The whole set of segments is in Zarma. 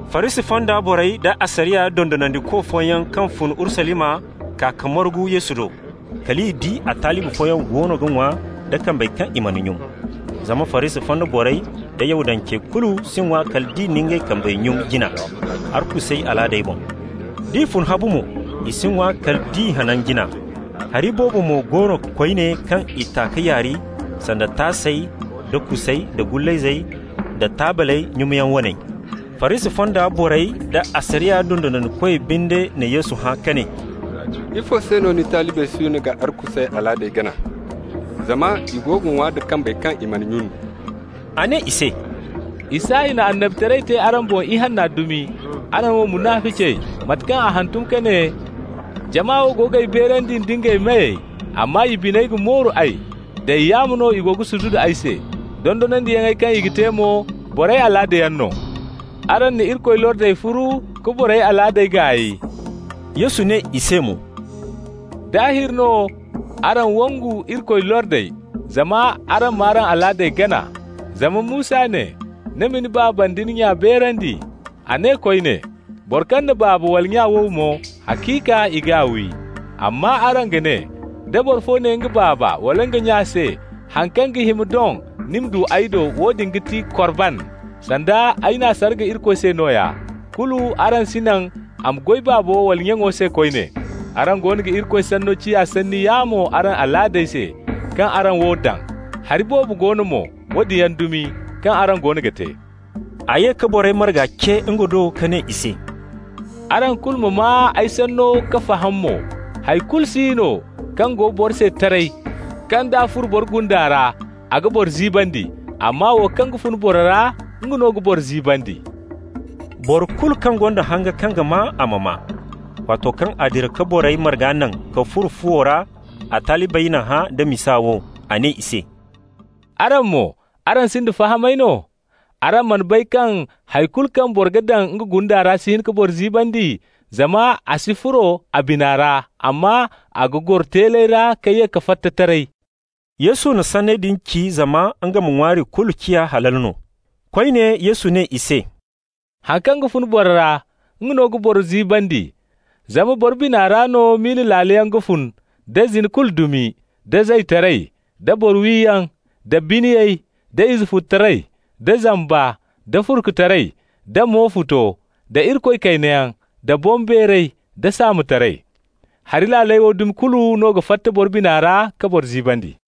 Farisi fonda borey da asariya dondonandiko fooyaŋ kaŋ fun Urusalima kaa ka margu Yesu do. Kal i di a talibi fooyaŋ goono ga ŋwa da kambey kaŋ i mana nyun. Zama Farisi fonda borey da Yahudancey kulu si ŋwa kala nd'i na ngey kambey nyun jina, arkusey alaadey boŋ. D'i fun habu mo, i si ŋwa kala nd'i hanan jina. Hari boobo mo go no koyne kaŋ i ta ka yaari, sanda taasey da kusey da gullayzey da taabley nyunyaŋ waney. Farisi fonda borey da asariya dondonandikoy binde na Yesu hã ka ne: «Ifo se no ni talibey siino ga arkusey alaadey gana, zama i go ga ŋwa da kambey kaŋ i mana nyun.» A ne i se: «Isaya na annabitaray te araŋ boŋ ihanna dumi, araŋ wo munaficey, mate kaŋ a hantum ka ne: ‹Jama wo go g'ay beerandi nda ngey meyey, amma i biney ga mooru ay. Day yaamo no i go ga sududu ay se. Dondonandiyaŋey kaŋ i ga te mo, borey alaadayaŋ no.› Araŋ na Irikoy lordey furu ka borey alaadey gaay.» Yesu ne i se mo: «Daahir no araŋ wangu Irikoy lordey, zama araŋ m'araŋ alaadey gana. Zama Musa ne: ‹Ni ma ni baaba nda ni nya beerandi.› A ne koyne: ‹Boro kaŋ na baaba wala nya wow mo, haciika i g'a wi.› Amma araŋ ga ne: ‹Da boro fo ne nga baaba wala nga nya se: Haŋ kaŋ ga hima doŋ ni ma du ay do, woodin ga ti Korban› (sanda, ay n'a sarga Irikoy se nooya), kulu araŋ si naŋ a ma goy baabo wala nyaŋo se koyne. Araŋ goono ga Irikoy sanno ciya sanni yaamo araŋ alaadey se, kaŋ araŋ wo daŋ. Hari boobo go no mo, woodin yaŋ dumi, kaŋ araŋ goono ga te.» A ye ka borey marga ce nga do ka ne i se: «Araŋ kulu ma maa ay sanno ka faham mo: hay kulu si no kaŋ go boro se taray, kaŋ d'a furo boro gunda ra, a ga boro ziibandi. Amma wo kaŋ ga fun boro ra, nga no ga boro ziibandi.» Boro kulu kaŋ gonda hanga kaŋ ga maa, a ma maa! Waato kaŋ a dira ka borey marga naŋ ka furo fuwo ra a talibey na hã da misa wo. A ne i se: «Araŋ mo, araŋ sinda fahamay no? Araŋ mana bay kaŋ hay kulu kaŋ boro ga daŋ nga gunda ra si hin ka boro ziibandi, zama a si furo a bina ra, amma a ga goro teeley ra ka ye ka fatta taray.» (Yesu na sanney din ci zama nga ma ŋwaari kulu ciya halal no.) Koyne, Yesu ne i se: «Haŋ kaŋ ga fun boro ra, nga no ga boro ziibandi. Zama boro bina ra no miila laaley yaŋ ga fun, da zina kulu dumi, da zaytaray, da boro wiyaŋ, da biniyay, da izefututaray, da zamba, da furkutaray, da mo futo, da Irikoy kaynayaŋ, da boŋbeeray, da saamotaray. Hari laaley wo dumi kulu no ga fatta boro bina ra ka boro ziibandi.»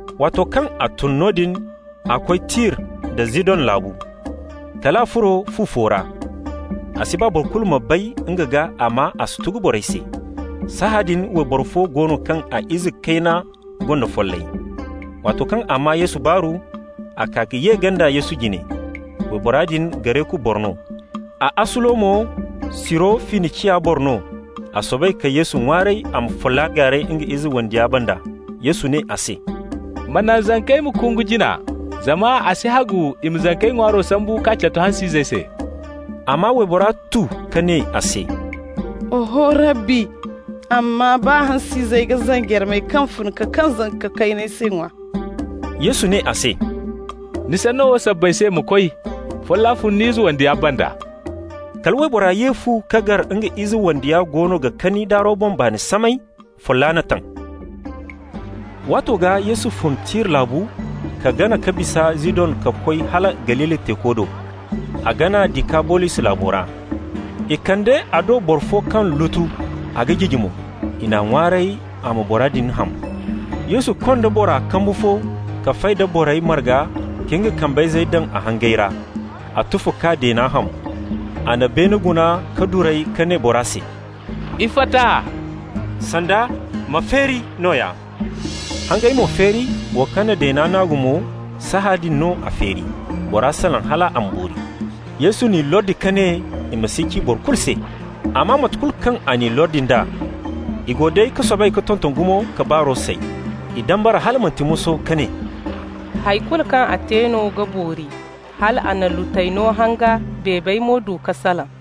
Waato kaŋ a tun noodin, a koy Tir da Zidong laabu. Kal a furo fu fo ra. A si ba boro kulu ma bay nga gaa, amma a si tugu borey se. Sahãadin wayboro fo go no kaŋ a ize kayna gonda follay. Waato kaŋ a maa Yesu baaru, a kaa ka ye ganda Yesu jine. Waybora din Gareku boro no, a asulo mo Siro-Finiciya boro no. A soobay ka Yesu ŋwaaray a ma folla gaaray nga ize wandiya banda. Yesu ne a se: «Ma naŋ zankey ma kungu jina, zama a si hagu i ma zankey ŋwaaro sambu k'a catu hans'izey se.» Amma waybora tu ka ne a se: «Oho, Rabbi. Amma baa hans'izey ga zanjarmey kaŋ ga fun ka kaŋ zanka kayney se ŋwa.» Yesu ne a se: «Ni sanno wo sabbay se, ma koy. Folla fun ni ize wandiya banda.» Kala waybora ye fu ka gar nga ize wandiya goono ga kani daaro boŋ, baani samay. Folla n'a taŋ. Waato gaa Yesu fun Tir laabu ka gana ka bisa Zidon ka koy hala Galili teeko do. A gana Dikabolis laabo ra. I kande a do boro fo kaŋ lutu, a ga jiji mo. I n'a ŋwaaray a ma bora din ham. Yesu konda bora kambu fo ka fay da borey marga ka nga kambayzey daŋ a hangey ra. A tufa k'a deena ham. A na beene guna ka duray, ka ne bora se: «Iffata!» (sanda: «Ma feeri!» nooya) Hangey mo feeri, wo kaŋ na deena naagu mo, sahãadin no a feeri. Bora salaŋ hal a ma boori. Yesu n'i lordi ka ne i ma si ci boro kulu se. Amma mate kulu kaŋ a n'i lordi nd'a, i go day ka soobay ka tonton gumo ka baaro say. I dambara hala manti moso ka ne: «Hay kulu kaŋ a te no ga boori, hal a na lutey no hanga, beebey mo du ka salaŋ.»